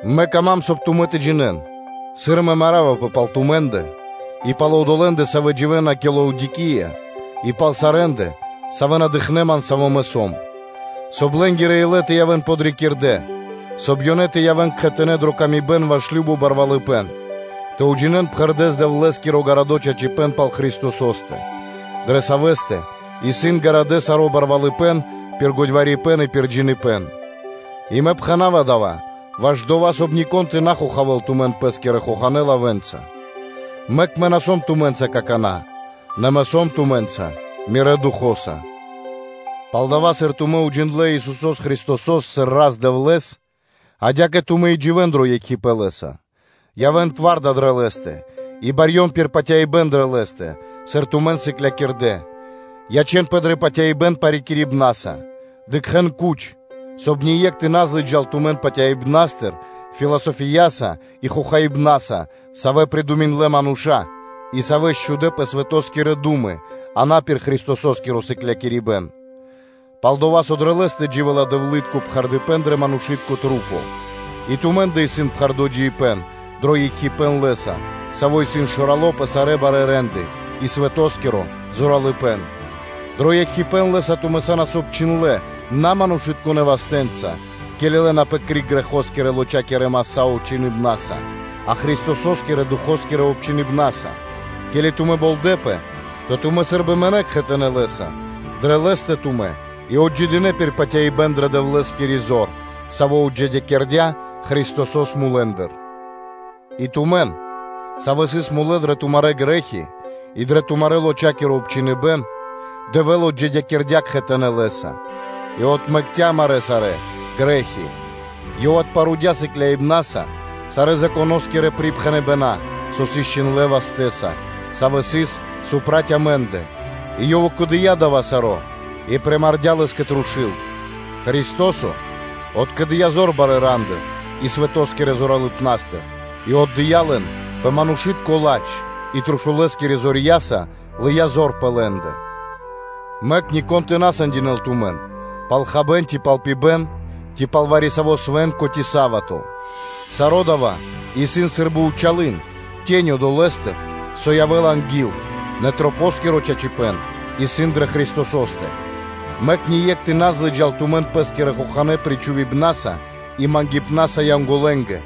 Мэ кама́м, соб (кай) тумэ́ тэ джинэ́н, сыр мэ маравпэ пал тумэ́ндэ и пал одолэ́ндэ, савэ́ дживэ́на кэ Лаодикия и пал сарэ́ндэ, савэ́ на дыкхнэ́ ман, саво́ мэ сом, соб (кай) лэ́нгирэ илэ тэ явэ́н подрикирдэ, соб (кай) ёнэ тэ явэ́н кхэтанэ́ дрэ паты́в кэ яви́р мануша́ ваш кажно барвалыпэ́н, тэ уджинэ́н пхэрдэ́с Дэвлэ́скиро гарадо́ чачипэ́н пал Христосо́стэ, дрэ Савэ́стэ исын гарадо́ саро́ кучипэ́н пир годьварипэн и пир джиныбэ́н. И мэ пхэна́ва дава́ ваш дова́, соб (кай) нико́н тэ на хохавэ́л тумэн пэ́скирэ хоханэ́ лавэ́нца. Мэк мэ на сом тумэ́нца какана́, нэ мэ сом тумэ́нца мирэ́ духо́са. Палдава́, сыр тумэ́ уджиндлэ́ Исусо́с Христосо́с сыр Рас-Дэвлэ́с, адя́кэ тумэ́ и дживэ́н дро екхипэ́н Лэ́са, Явэ́н би кунипнаскирэ (тварда) дрэ Лэ́стэ и барьён пир патяибэ́н дрэ Лэ́стэ, сыр тумэн сыклякирдэ́, ячэ́нпэ дрэ патяибэ́н парикирибнаса. Дыкхэ́н кучэс, соб (кай) ние́кх тэ на злыджал тумэн патяибнастыр философияса и хохаибнаса, савэ́ придуминдлэ мануша́, и савэ́ счхудэ пэ свэто́скирэ ду́мы, а на пэ Христосо́скиро сыклякирибэ́н. Пал-дова́ со дрэ Лэ́стэ дживэ́ла Дэвлы́тко пхэрдыпэн дрэ манушы́тка маса́ пир ду́хо (фа́но), и тумэ́ндэ исын пхэрдо́ джиибэ́н дро екхипэ́н Лэ́са, Саво́ исын Шэрало́ пэ сарэ́ барэ́ рандэ и свэтоскиро зоралыпэ́н, дро екхипэ́н Лэ́са тумэ́ са́нас обчхиндлэ́ на манушытконэ́ вастэ́нца, ке́ли лэнапэ криг грэхоскирэ лочакирэ маса́ обчхиныбнаса, а Христосо́скирэ-духо́скирэ обчхиныбнаса; ке́ли тумэ́ болдэпэ, то тумэ́ сы́рбы мынэ́ кхэтанэ́ Лэ́са, дрэ Лэ́стэ тумэ́ и отджидынэ пир патяибэ́н дрэ Дэвлэ́скири зор, Саво́ отджидякирдя́ Христосо́с мулэ́ндыр. И тумэн, савэ́ сыс мулэ́ дрэ тумарэ́ грэ́хи и дрэ тумарэ́-лочакиро обчхиныбэн, Дэвэ́л отджидякирдя́ кхэтанэ́ Лэ́са и отмэкця́ амарэ́ сарэ́ грэ́хи; Ёв отпарудя сыкляибнаса сарэ́ припхэныбэна́ Законо́стыр, со сыс чхиндлэ́ вастэ́са, савэ́ сыс проти амэ́ндэ, и Ёв укэдыя дава́ саро́, и примардя лэс кэ трушу́л; Христо́со откэдыя зор барэ́ рандыр и свэто́скирэ зоралыпнастыр и отдыя́ лэн пэ манушы́тко ладж, и трушулэскирэ зорья́са лыя́ зор пэ лэ́ндэ. Мэк нико́н тэ на сэндинэл тумэн пал хабэ́н ци пал пибэ́н, ци пал вари-саво́ свэ́нко, ци са́вато (субо́та), Саро́ дава́ исын сы́рбы зэр (тенё) долэ́стыр, со явэ́ла анги́л, нэ чачипэ́н исын дрэ Христосо́скирэ Маса́. Мэк ние́кх тэ на злыджал тумэн пэ́скирэ хоханэ́ кандыпнаса и мангипнаса Янголэнгэ,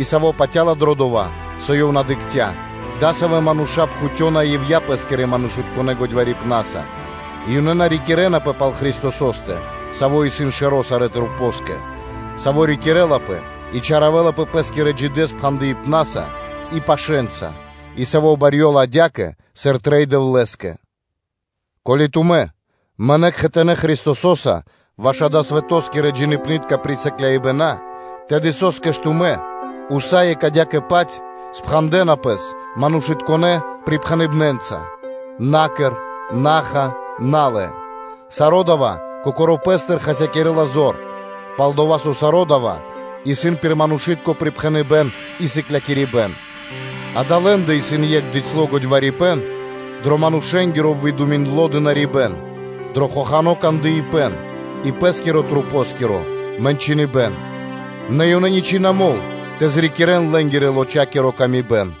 и саво́ патя́ла дро дова́, со ёв на дыкхця́, – дасавэ́ мануша́ пхутёна ивья́ (дармэс) пэ́скирэ манушытконэ́ годьварипнаса, и ёнэ на рикирэнапэ пал Христосо́стэ, Саво́ исын Шэро́ сарэ́нгэ, Саво́ рикирлапэ и чалякирэлапэ Пэ́скирэ джидэ́ спхандыпнаса и пашэнца, и, Саво́ барьёла адя́кэ, сыр трэй Дэвлэ́скэ. Ко́ли тумэ́ мынэ́ кхэтанэ́ Христосо́са ваш далэ́ свэто́скирэ-джиибнытка присыкляибэна, тэды со́скэ тумэ́ усае́кх адя́кэ-паць спхандэна пэс манушытконэ́ припхэныбнэнца? “На кэр, на ха, на лэ”, саро́ дава́ кокоро́ пэ́стыр хасякирэ́ла зор: пал-дова́ со саро́ дава́ исын пир манушы́тко припхэныбэ́н и сыклякирибэ́н, Дава́ лэ́ндэ исын екх дыцьло годьварипэн дро манушэ́нгиро выдуминдло дынарибэ́н, дро хохано́ кандыпэн и пэ́скирэ-масэнгирэ мэ́ньки, нэ ёнэ исын ничы́ на мол тэ обрикирэн лэ́нгирэ-лочакиро выкэдыибэн.